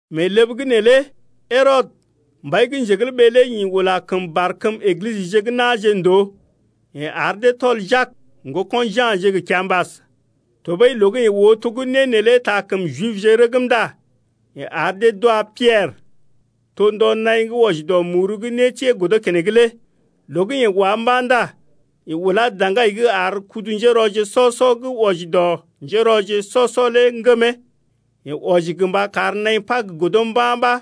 Mee ləb’g neelé Herɔdə, mbai lé ḭ ula kəm barkəm Eglisəje gə́ na̰je ndòo. Yeḛ ar dee tɔl Jak, ŋgoko̰ Ja̰je gə kiambas. Tɔɓəi loo gə́ yeḛ oo to gə́ né neelé taa kəm Jibje rəgm ndá yeḛ ar dee d’wa Piɛrə. To ndɔ naḭ gə́ wɔji dɔ muru gə́ nétiee godo keneŋ lé. Loo gə́ yeḛ wá mba̰ ndá yeḛ ulá daŋgai’g ar kudu-njérɔje sɔ-sɔ gə́ wɔji dɔ njérɔje sɔ-sɔ lé ŋgəm təa. Yeḛ wɔji gə mba kar naḭ Pag godo mba̰ ɓa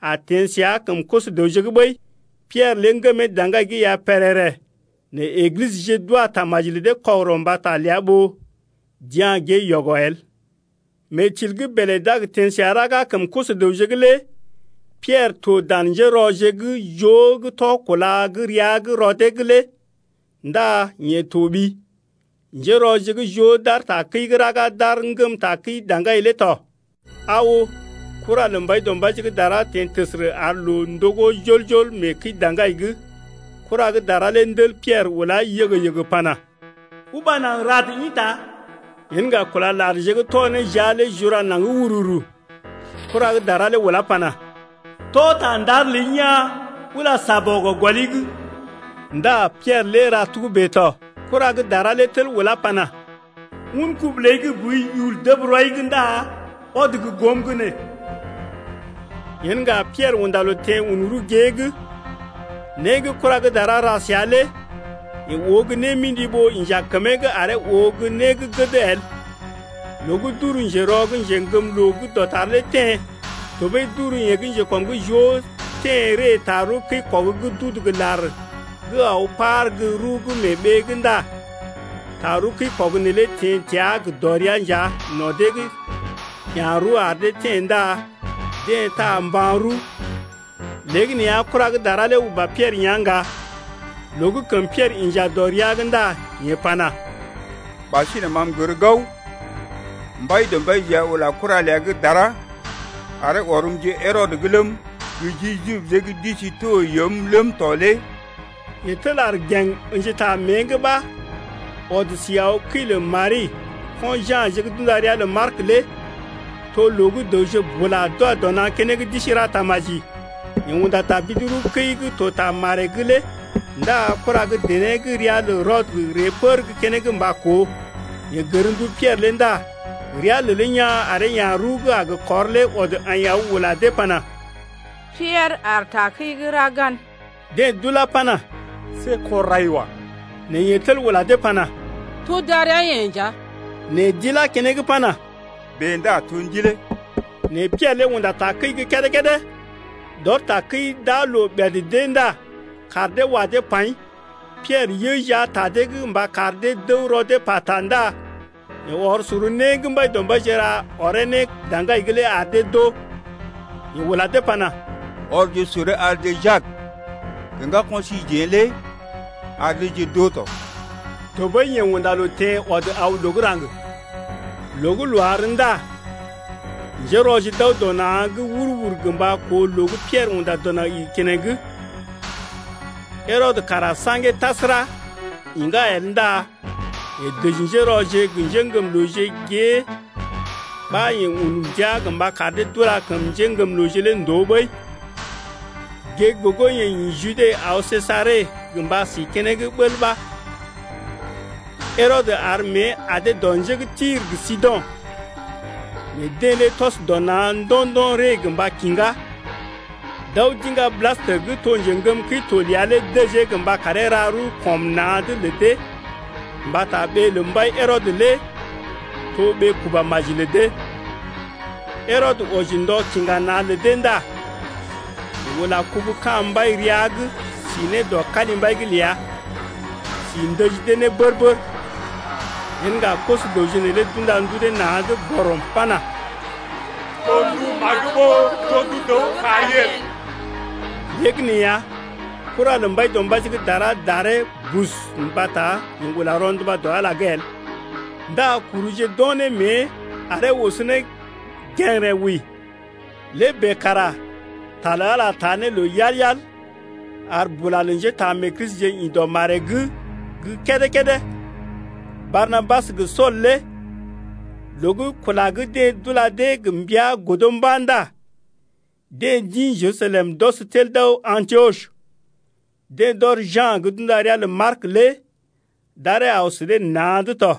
a teḛ səa kəm koso-dəwje’g ɓəi. Piɛrə lé ŋgəmee daŋgai’g ya pèrèrè nɛ Eglisəje d’wa tamaji lə dee kɔgərɔ mbata ləa ɓó d’ya̰ gée yɔgɔ el. Mee til gə́ bèlè d’a gə teḛ səa raga kəm koso-dəwje’g lé Piɛrə to dan njérɔje gə́ joo gə́ tɔ kúla gə́ rəa’g rɔ dee’g lé ndá yeḛ toɓi. Njérɔje joo d’aar takəi’g raga d’aar ŋgəm takəi daŋgai lé tɔ. Aa oo, kura lə Mbaidɔmbaije gə́ dara teḛ təsərə ar loo ndogó jol-jol mee kəi-daŋgai’g. Kura gə́ dara lé ndel Piɛrə ulá yəgə-yəgə pana: Uba naŋg rad ḭta! Yen ŋga kúla larje gə́ tɔ ne jia lé jura naŋg wururu. Kura gə́ dara lé ulá pana: Tɔ ta ndar ləi maji, tɔɓəi ula Négɔl gɔli’g tɔ. Ndá Piɛrə lé ra togə́bè tɔ. Kura gə́ dara lé tel ulá pana: Un kubu ləi gə́ boi yul dəb rɔi’g ndá ɔd gə́ goom’g nee. Yen ŋga Piɛrə unda loo teḛ un rəw gée’g tɔ. Né gə́ kura gə́ dara ra səa lé yeḛ oo gə́ némḭdi ɓó inja kəmee’g aree oo gə́ né gə́ gəd el. Loo gə́ d’uru njerɔ gə́ njeŋgəmloo gə́ dɔtar lé teḛ, tɔɓəi d’uru yeḛ gə́ njekɔm’g joo lé teḛ ree tarəw kəi-kɔg gə́ d’udu gə lar gə́ aw par gə́ rəw gə́ mee ɓee’g ndá tarəw kəi-kɔg neelé teḛ təa gə dɔrea nja no̰ dee’g ya̰ rəw ar dee teḛ ndá deḛ taa mban-rəw. Léegəneeya kura gə́ dara lé uba Piɛrə yá̰ ŋga. Loo gə́ kəm Piɛrə inja dɔ rəa’g ndá yeḛ pana: Ɓasinè ma m’gər gao, Mbaidɔmbaije ya ula kura ləa gə́ dara aree ɔrm ji Herɔdə’g ləm, gə ji Jibje gə́ d’isi to yoom ləm lé tɔ. Yeḛ tel aar gèŋ ə̰ji ta mée’g ɓa ɔd si aw kəi lə Mari, ko̰ Ja̰je gə́ d’unda ria lə Mark lé to loo gə́ dəwje bula d’wa dɔ na̰ keneŋ d’isi ra tamaji. Yeḛ unda tabidi-rəwkəi gə́ to ta maree’g lé ndá kura gə́ dené gə́ ria lə Rodə ree pər gə́ keneŋ mba koo. Yeḛ gər ndu Piɛrə lé ndá rəa lelee yaa̰ aree ya̰ rəw gə́ a gə kɔr lé ɔd aḭ aw ula dee pana: Piɛrə aar takəi’g raga’n. Deḛ d’ulá pana: See kɔr rai wa. Nɛ yeḛ tel ula dee pana: To darəa-yeḛ nja. Nɛ d’ilá keneŋ pana: Bèe ndá to ndilee. Nɛ Piɛrə lé unda takəi gə́ kédé-kédé. D’ɔr takəi d’aa loo ɓèd d’ée ndá kaar dee wa dee paḭ. Piɛrə yə jia ta dee gə mba kar dee d’əw rɔ dee pata ndá yeḛ ɔr sor né gə́ Mbaidɔmbaije ra ɔree ne daŋgai’g lé ar dee d’oo. Yeḛ ula dee pana: Ɔrje soree arje Jak gə ŋgako̰ síjeḛ lé ar deeje d’oo tɔ. Tɔɓəi yeḛ unda loo teḛ ɔd aw loo gə́ raŋg. Loo gə́ loo àr ndá njérɔje d’aw dɔ na̰’g wur-wur gə mba koo loo gə́ Piɛrə unda dɔ naŋg igi keneŋ. Herɔdə kara saŋgee tasəra, iŋgá el ndá yeḛ dəji njérɔje gə́ njéŋgəmlooje gée ɓa yeḛ un ndia gə mba kar dee d’ula kəm njéŋgəmlooje lé ndòo ɓəi. Gée gə́ gogo yeḛ ḭ Jude aw Sejare gə mba si keneŋ bəl ɓa. Herɔdə ar mée adee dɔ njé gə́ Tir gə Sido̰’g. Nɛ deḛ lé tɔs dɔ na̰ ndo̰-ndo̰ ree gə mba kiŋgá, d’aw d’iŋga Blastə gə́ to njeŋgəm kəi-to ləa lé dəjee gə mba karee ra rəw kɔm na̰’d lə dee mbata ɓee lə mbai Herɔdə lé to ɓee kuba maji lə dee. Herɔdə wɔji ndɔ kiŋga na̰ lə dee ndá yeḛ ula kubu ka̰ mbai rəa’g si ne dɔ kalimbai’g ləa, si ndəji dee ne bər-bər. Yen ŋga koso-dəwje neelé d’unda ndu dee na̰’d bɔrɔm pana: To ndu magə ɓó to ndu dəw gə́ kari el. Léegəneeya kura lə Mbaidɔmbaije gə́ dara daree bus mbata yeḛ ula rɔnduba dɔ Ala’g el. Ndá kuruje d’o̰ ne mée aree oso ne gə̰gərə wəi. Lé bèe kara ta lə Ala taa ne loo yal-yal ar bula lə njétaamee-Kristije ḭ dɔ maree’g gə́ kédé-kédé. Barnabas gə Sool lé loo gə́ kula gə́ deḛ d’ula dee gə mbəa lé godo mba̰ ndá deḛ d’ḭ Jerusalem d’ɔs tel d’aw Antiɔs. Deḛ d’ɔr Ja̰ gə́ d’unda ria lə Mark lé d’aree aw sə dee na̰’d tɔ.